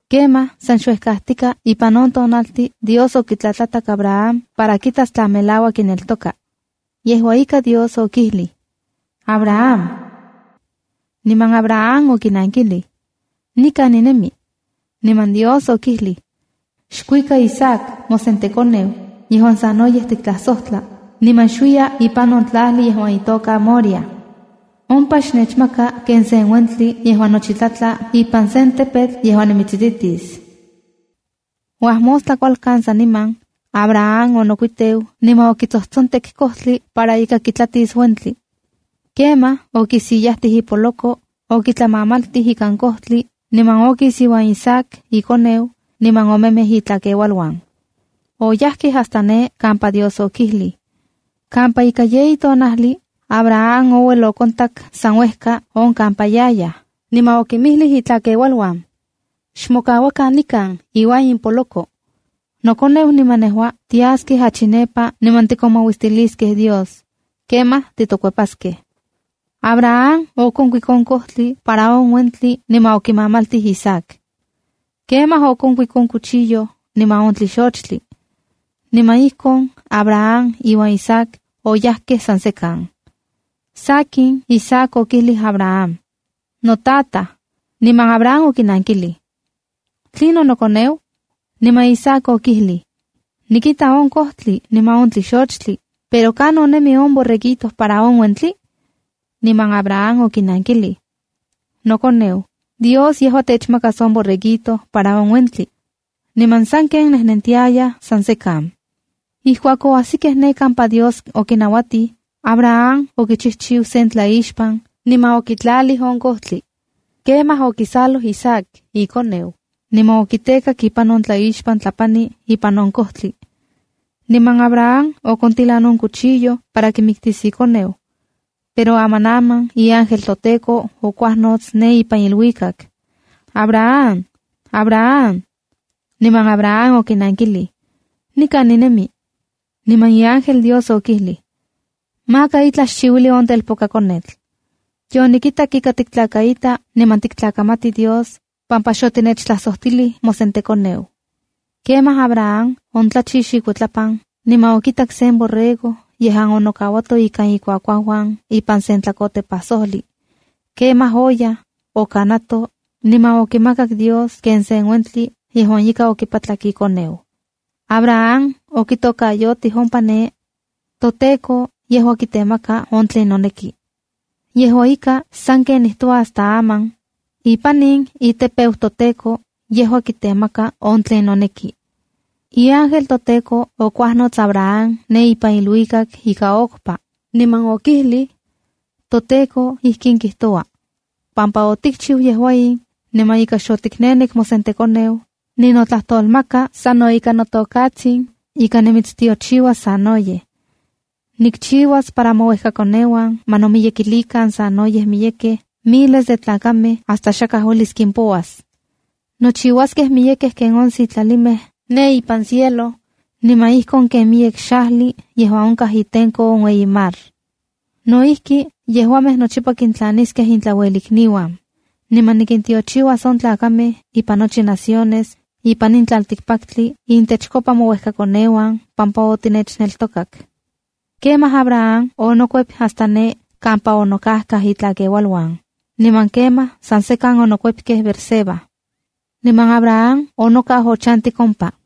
Kemaj san xuejkatika ipan on tonaltin Dios okitlatlatak Abraham para kitas tla melauak kineltoka. Yejua ika, Dios okijlij: —Abraham. Niman Abraham okinankilij: —Nikan ninemi. Niman Dios okijlij: —Xkuika Isaac mosentekoneu yejuan sanoyej tiktlajsojtla, niman xuiya ipan on tlajli yejuan itoka Moriah. Ompa xnechmaka ken sen uentli yejuan nochi tlatla ipan sen tepetl yejuan nimitsititis. Uajmostla kualkan saniman, Abraham onokuiteu niman okitsojtsontek kojtli para ika kitlatis uentli. Kemaj okisiyajtij ipoloko, okitlamamaltij ikan kojtli, niman okis iuan Isaac ikoneu, niman omemej itlakeualuan. Oyajkej hasta ne kampa Dios okijlij. Kampa ika yeyi tonajli, Abraham ouel okontak san uejka on kampa yayaj, niman okinmijlij itlakeualuan: —Xmokauakan nikan iuan in poloko. Nokoneu niman nejua tiaskej achi nepa niman tikomauistiliskej Dios. Kemaj titokuepaskej. Abraham okuik on kojtli para on uentli niman okimamaltij Isaac. Kemaj okonkuik on cuchillo, niman on tlixochtli. Niman ijkon Abraham iuan Isaac oyajkej san sekan. Sakin, Isaac okijlij Abraham: —¡Notataj! Niman Abraham okinankilij: ¿Tlinon nokoneu? Niman Isaac okijlij: —Nikita on kojtli niman on tlixochtli, pero ¿kanon nemi on borreguito para on uentli? Niman Abraham okinankilij: —Nokoneu, Dios yejua techmakas on borreguito para on uentli. Niman sanken onejnentiajkej san sekan. Ijkuak oajsikej ne kampa Dios okinauatij, Abraham okichijchiu sen tlaixpan, niman okitlatlalij on kojtli. Kemaj okisaloj Isaac ikoneu, niman okitekak ipan on tlaixpan tlapani ipan on kojtli. Niman Abraham okontilan on cuchillo para kimiktis ikoneu. Pero amanaman iángel toTEKO okuajnots ne ipan iluikak: —¡Abraham! ¡Abraham! Niman Abraham okinankilij: —Nikan ninemi. Niman iángel Dios okijlij: —Maka itlaj xchiuili on telpokakonetl. Yonikitak ika tiktlakaita niman tiktlakamati Dios pampa xotinechtlajsojtilij mosentekoneu. Kemaj Abraham ontlachix ikuitlapan niman okitak sen borrego yejuan onokauato ikan ikuakuauuan ipan sen tlakotepajsojli. Kemaj oyaj, okanato, niman okimakak Dios ken sen uentli yejuan ika okipatlak ikoneu. Abraham okitokayotij ompa ne: “ToTEKO yejua kitemaka on tlen noneki.” Yejua ika, sanken nijtoua hasta aman: “Ipan in itepeu toTEKO, yejua kitemaka on tlen noneki.” Iángel toTEKO okuajnots Abraham ne ipan iluikak ika okpa, niman okijlij: —ToTEKO ijkin kijtoua: “Pampa otikchiu yejua in, niman ika xotiknenek mosentekoneu, ninotlajtolmaka sano ika notokatsin, ika nimitstiochiuas sanoyej. Nikchiuas para mouejkakoneuan ma nomiyekilikan sanoyej miyekej miles de tlakamej hasta xakaj uelis kimpouas. Nochiuaskej miyekej ken on sitlalimej ne ipan cielo, niman ijkon ken miyek xajli yejuan onkaj itenko on ueyi mar. No ijki, yejuamej nochipa kintlaniskej intlauelikniuan. Niman nikintiochiuas on tlakamej ipan nochi naciones ipan in tlaltikpaktli intechkopa mouekakoneuan pampa otinechneltokak.” Kemaj Abraham onokuep hasta ne kampa onokajkaj itlakeualuan, niman kemaj san sekan onokuepkej Beerseba. Niman Abraham onokau ochantik ompa.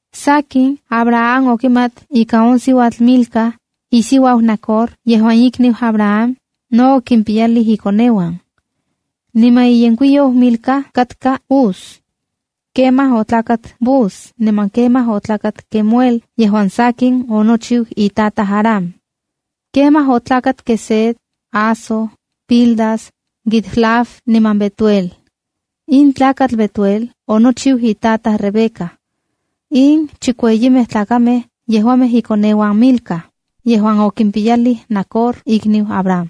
Sakin, Abraham okimat ika on siuatl Milca, isiuau Nacor yejuan ikniu Abraham, no okimpiyalij ikoneuan. Niman iyenkuiyou Milca katka Uz. Kemaj otlakat Buz niman kemaj otlakat Quemuel yejuan sakin onochiu itataj Aram. Kemaj otlakat Quesed, Hazo, Pildas, Jidlaf niman Betuel. In tlakatl Betuel onochiu itataj Rebeca. In chikueyimej tlakamej yejuamej ikoneuan Milca, yejuan okimpiyalij Nacor ikniu Abraham.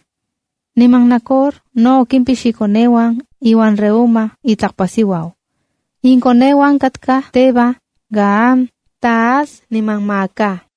Niman Nacor no okimpix ikoneuan iuan Reúma itlakpasiuau. Inkoneuan katkaj Teba, Gaham, Tahas niman Maaca.